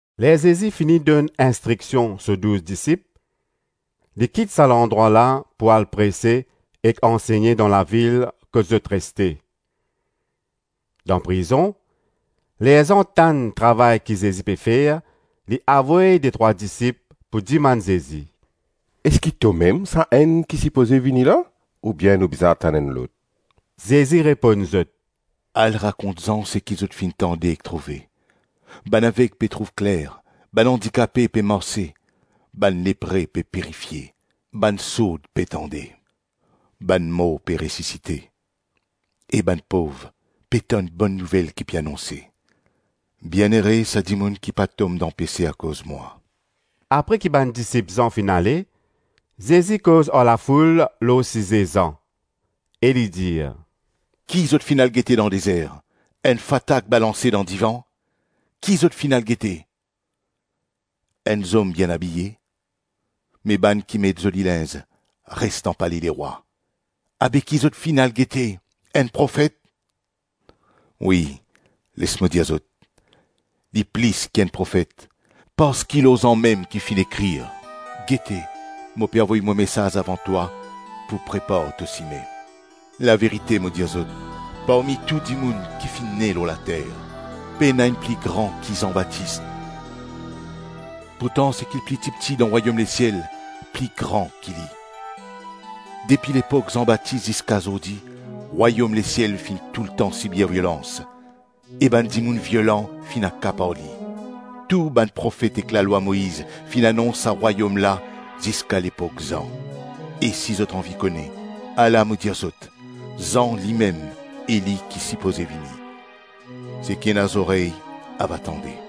Ler Zezi fini donn instriksion so douz disip, li kit sa landrwa la pou al prese ek ansegne dan lavil kot zot reste. Dan prizon, ler Zan tann travay ki Zezi pe fer, li avoy detrwa disip, pou dimann Zezi, “Eski tomem Sa-Enn ki sipoze vini la, oubien nou bizin atann enn lot?” Zezi reponn zot, “Al rakont Zan seki zot finn tande ek trouve: bann aveg pe trouv kler, bann andikape pe marse, bann lepre pe pirifie, bann sourd pe tande, bann mor pe resisite e bann pov pe tann Bonn Nouvel ki pe anonse. Bienere, sa dimoun ki pa tom dan pese akoz mwa.” Apre ki bann disip Zan finn ale, Zezi koz ar lafoul lor size Zan, e li dir: “Ki zot finn al gete dan dezer? Enn fatak balanse dan divan? Ki zot finn al gete? Enn zom bien abiye? Me bann ki met zoli linz, res dan pale lerwa. Abe ki zot finn al gete? Enn profet? Wi, les mo dir zot, li plis ki enn profet. Parski lor Zan mem ki finn ekrir: ‘Gete, mo pe avoy mo mesaze avan twa pou prepar to sime.’ Laverite mo dir zot, parmi tou dimoun ki finn ne lor later, pena enn pli gran ki Zan Batis; pourtan sa ki pli tipti dan rwayom lesiel, pli gran ki li. Depi lepok Zan Batis ziska zordi, rwayom lesiel finn toultan sibir violans e bann dimoun violan finn akapar li. Tou bann profet ek lalwa Moiz finn anons sa rwayom la ziska lepok Zan. E si zot anvi kone, ala mo dir zot. Zan, limem Eli ki sipoze vini. Seki ena zorey, ava tande.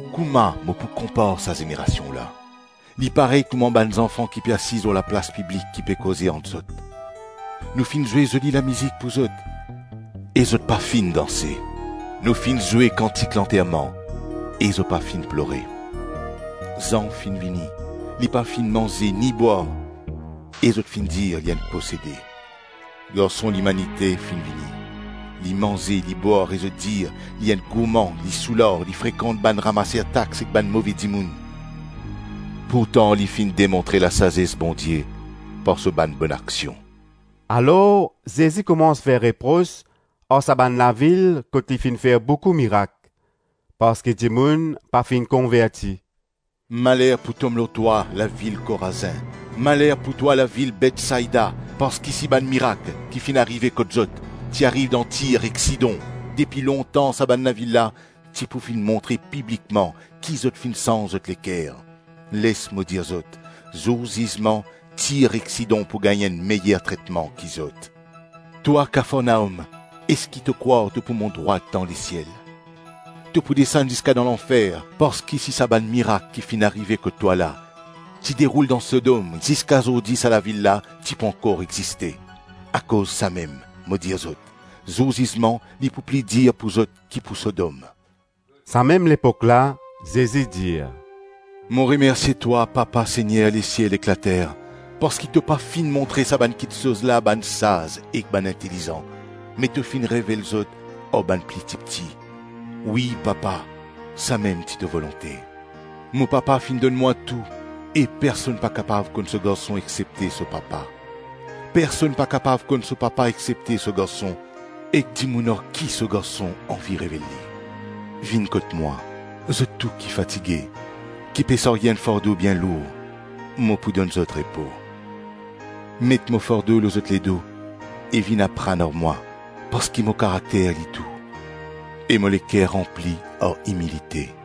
Koman mo pou konpar sa zenerasion la? Li parey kouma bann zanfan ki pe asize lor laplas piblik ki pe koze ant zot, ‘Nou finn zwe zoli lamizik pou zot e zot pa finn danse; nou finn zwe kantik lanterman e zot pa finn plore.’ Zan finn vini, li pa finn manze ni bwar, e zot finn dir, ‘Li enn posede!’ Garson Limanite finn vini, li manze, li bwar e zot dir, ‘Li enn gourman, li soular, li frekant bann ramaser tax ek bann move dimoun.’ Pourtan li finn demontre lasazes Bondie par so bann bonaksion.” Alor Zezi koumans fer repros ar sa bann lavil kot li finn fer boukou mirak parski dimoun pa finn konverti. “Maler pou tom lor twa, lavil Korazin! Maler pou twa, lavil Betsaida! Parski si bann mirak ki finn arive kot zot, ti ariv dan Tir ek Sidon, depi lontan sa bann lavil la ti pou finn montre piblikman ki zot finn sanz zot leker. Les mo dir zot, zour zizman, Tir ek Sidon pou gagn enn meyer tretman ki zot. Twa Kafarnaom, eski to krwar to pou mont drwat dan lesiel? To pou desann ziska dan lanfer parski si sa bann mirak ki finn arive kot twa la, ti deroul dan Sodom, ziska zordi sa lavil la ti pou ankor existe. Akoz samem, mo dir zot, zour zizman li pou pli dir pou zot ki pou Sodom.” Samem lepok la Zezi dir “Mo remersie twa, Papa, Segner lesiel ek later, parski to pa finn montre sa bann kiksoz la bann saz ek bann intelizan, me to finn revel zot ar bann pli tipti. Wi, Papa samem ti to volonte. Mo Papa finn donn mwa tou e personn pa kapav konn so garson exsepte so Papa, personn pa kapav konn so Papa exsepte so Garson ek dimoun ar ki so garson anvi revel li. Vinn kot mwa zot tou ki fatige, ki pe sarye enn fardo bien lour, mo pou donn zot repo. Met mo fardo lor zot ledo, e vinn aprann ar mwa parski mo karakter li dou e mo leker ranpli ar imilite